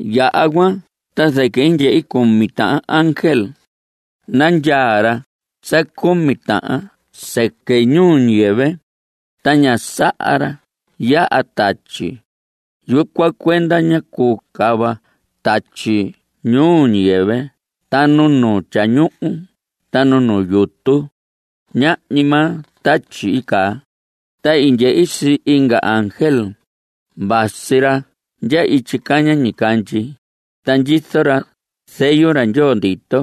Yaha cuan ta zɨquɨ i ndyehi cumi tahan ángel. Nandyaa ra sa cumi tahan sɨquɨ ñuu ñiyɨvɨ, ta ñá saha ra yaha tatyi. Yucuan cuenda ñá cuu cava tatyi ñuu ñiyɨvɨ ta nu nu tyañuhu ta nu nu yutu. Ñahñi maa tatyi i caa. Ta i ndyehi sii inga ángel. Vasi ra ndya ityi caña ñicandyi, ta ndyizo ra zeyu ra Ndyoo ndito.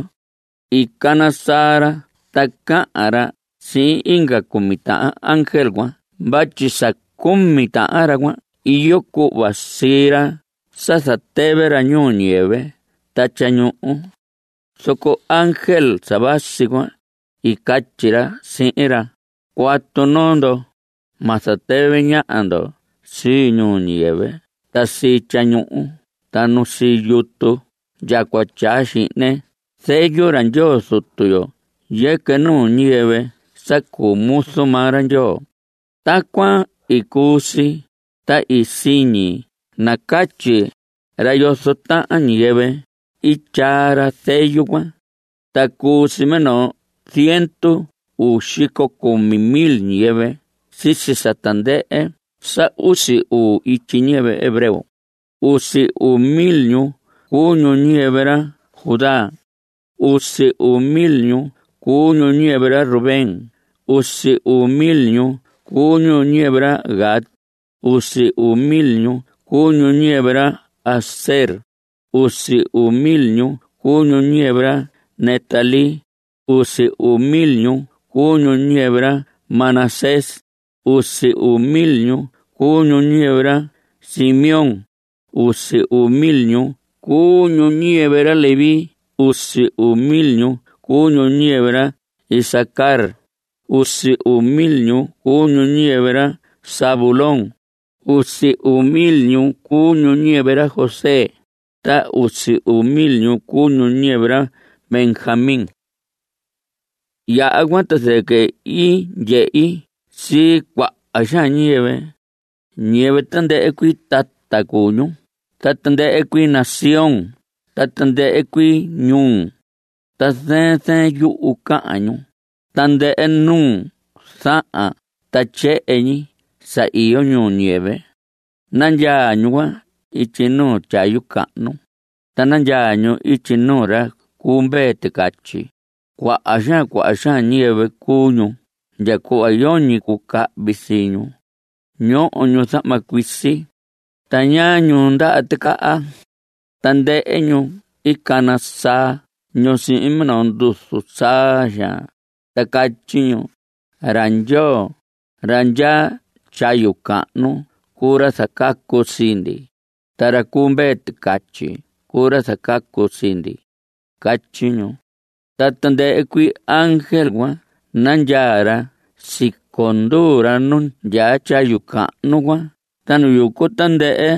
I cana saa ra ta cahan ra sihin inga cumi tahan ángel cuan vatyi sa cumi tahan ra cuan iyo cuhva sii ra sa zatɨvɨ ra ñuu ñiyɨvɨ ta tyañuhu. Zoco ángel sa vasi cuan, i catyi ra sihin ra: Cuatu noo ndo. Ma zatɨvɨ ñaha ndo sii ñuu ñiyɨvɨ ta sii tyañuhu ta nu sii yutu ndya cua tyaa xihne zeyu ra Ndyoo Zutu yo yɨquɨ nuu ñiyɨvɨ sa cuu muzu maa ra Ndyoo. Tacuan i cuu si, ta siñi nacatyi ra yozo tahan ñiyɨvɨ i tyaa ra zeyu cuan. Ta cuu si minoo ziendu uu xico cumi mil ñiyɨvɨ sisi tandɨhɨ sa usi uu ityi ñiyɨvɨ hebreo. Usi uu mil ñu cuu ñu ñiyɨvɨ ra Judá. Usi uu mil ñu cuu ñu ñiyɨvɨ ra Rubén. Usi uu mil ñu cuu ñu ñiyɨvɨ ra Gad. Usi uu mil ñu cuu ñu ñiyɨvɨ ra Aser. Usi uu mil ñu cuu ñu ñiyɨvɨ ra Neftalí. Usi uu mil ñu cuu ñu ñiyɨvɨ ra Manasés. Usi uu mil ñu cuu ñu ñiyɨvɨ ra Simeón. Usi uu mil ñu cuu ñu ñiyɨvɨ ra Leví. Usi uu mil ñu cuu ñu ñiyɨvɨ ra Isacar. Usi uu mil ñu cuu ñu ñiyɨvɨ ra Zabulón. Usi uu mil ñu cuu ñu ñiyɨvɨ ra José. Ta usi uu mil ñu cuu ñu ñiyɨvɨ ra Benjamín. Yaha cuan ta zɨquɨ i ndyehi sii cuaha xaan ñiyɨvɨ. Ñiyɨvɨ tandɨhɨ cuii tata cuu ñu ta tandɨhɨ cuii nación ta tandɨhɨ cuii ñuu. Ta zɨɨn zɨɨn yuhu cahan ñu, tandɨhɨ nuu zahan ta tyehen ñi sa iyo ñuu ñiyɨvɨ. Nandyaa ñu cuan ityi nuu tyayu cahnu, ta nandyaa ñu ityi nuu ra cu Mvee Ticatyi. Cuaha xaan cuaha xaan ñiyɨvɨ cuu ñu ndya cuhva yoñi cuu cahvi sii ñu. Ñoho ñu zahma cuisi, ta ñaa ñu ndaha ticaha. Tandɨhɨ ñu cana saa ñu sihin minoo nduzu saa xaan, ta catyi ñu: Ra Ndyoo, ra ndyaa tyayu cahnu cuu ra zacacu sii ndi, Ta ra cu Mvee Ticatyi cuu ra zacacu sii ndi. Catyi ñu. Ta tandɨhɨ cuii ángel cuan nandyaa ra siconduu ra nu ndyaa tyayu cahnu cuan ta nu yucu tandɨhɨ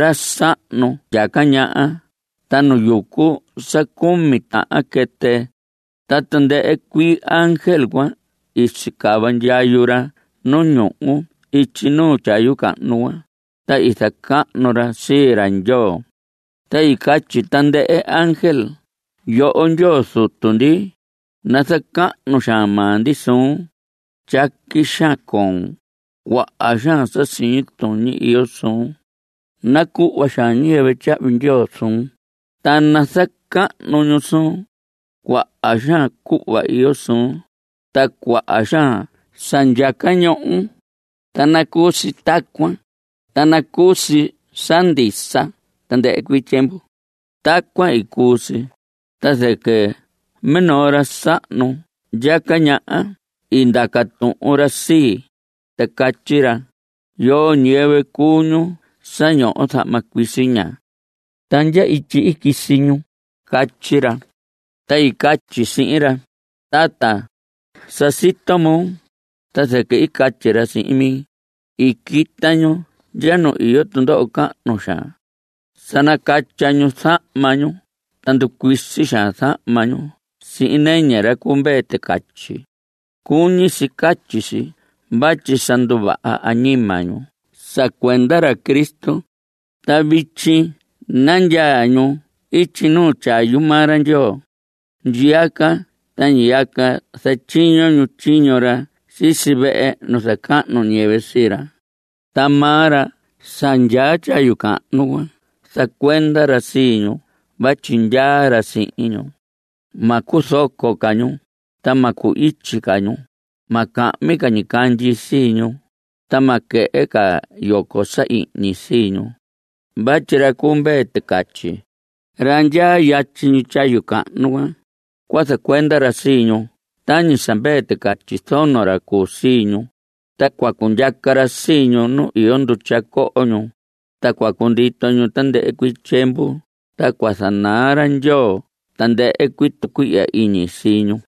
ra sahnu ndyaca ñaha ta nu yucu sa cumi tahan quɨtɨ. Ta tandɨhɨ cuii ángel cuan i sicava ndyayu ra nu ñuhu ityi nuu tyayu cahnu cuan, ta i zacahnu ra sii ra Ndyoo. Ta i catyi tandɨhɨ ángel: Yoho Ndyoo Zutu ndi, nazacahnu xaan maa ndi suun. Tyaqui xaan coon. Cuaha xaan sa siñi tuñi iyo suun. Nacuhva xaan ñiyɨvɨ tyahvi ndyoo suun, ta nazacahnu ñu suun. Cuaha xaan cuhva iyo suun, ta cuaha xaan sa ndyaca ñohon. Ta nacuu si tacuan, ta nacuu si sa ndisa tandɨhɨ cuii tyiemvu. Tacuan i cuu si, ta zɨquɨ minoo ra sahnu ndyaca ñaha i ndaca tuhun ra sii, ta catyi ra: ¿Yoo ñiyɨvɨ cuu ñu sa ñoho zahma cuisi ña? ¿Ta ndya ityi i quisi ñu? Catyi ra. Ta i catyi sihin ra: Tata, sa sito moo. Ta zɨquɨ i catyi ra sihin mi: I quita ñu ndya nu iyo tundoho cahnu xaan. Sa nacatya ñu zahma ñu ta nducuisi zahma ñu sihin nɨñɨ ra cu Mvee Ticatyi. (Cuñi si catyi si vatyi sa nduvaha añima ñu sa cuenda ra Cristo.) Ta vityi nandyaa ñu ityi nuu tyayu maa ra Ndyoo. Ndyiyaca ta ñiyaca zatyiño ñu tyiño ra sisi vehe nu zacahnu ñiyɨvɨ sii ra. Ta maa ra sa ndyaa tyayu cahnu cuan zacuenda ra sii ñu vatyi ndyaa ra sihin ñu. Ma cuzoco ca ñu. Ta ma cu‑ityi ca ñu. Ma cahmi ca ñicandyi sii ñu, ta ma quehe ca yoco sa ihñi sii ñu. Vatyi ra cu Mvee Ticatyi, ra ndyaa yatyi ñi tyayu cahnu cuan, cua zacuenda ra sii ñu tañi sa mvee ticatyi zono ra cuu sii ñu, ta cua cundyaca ra sii ñu nu iyo ndutya coho ñu, ta cua cundito ñu tandɨhɨ cuii tyiemvu. Ta cua zanaa ra Ndyoo tandɨhɨ cuii tucuihya iñi sii ñu.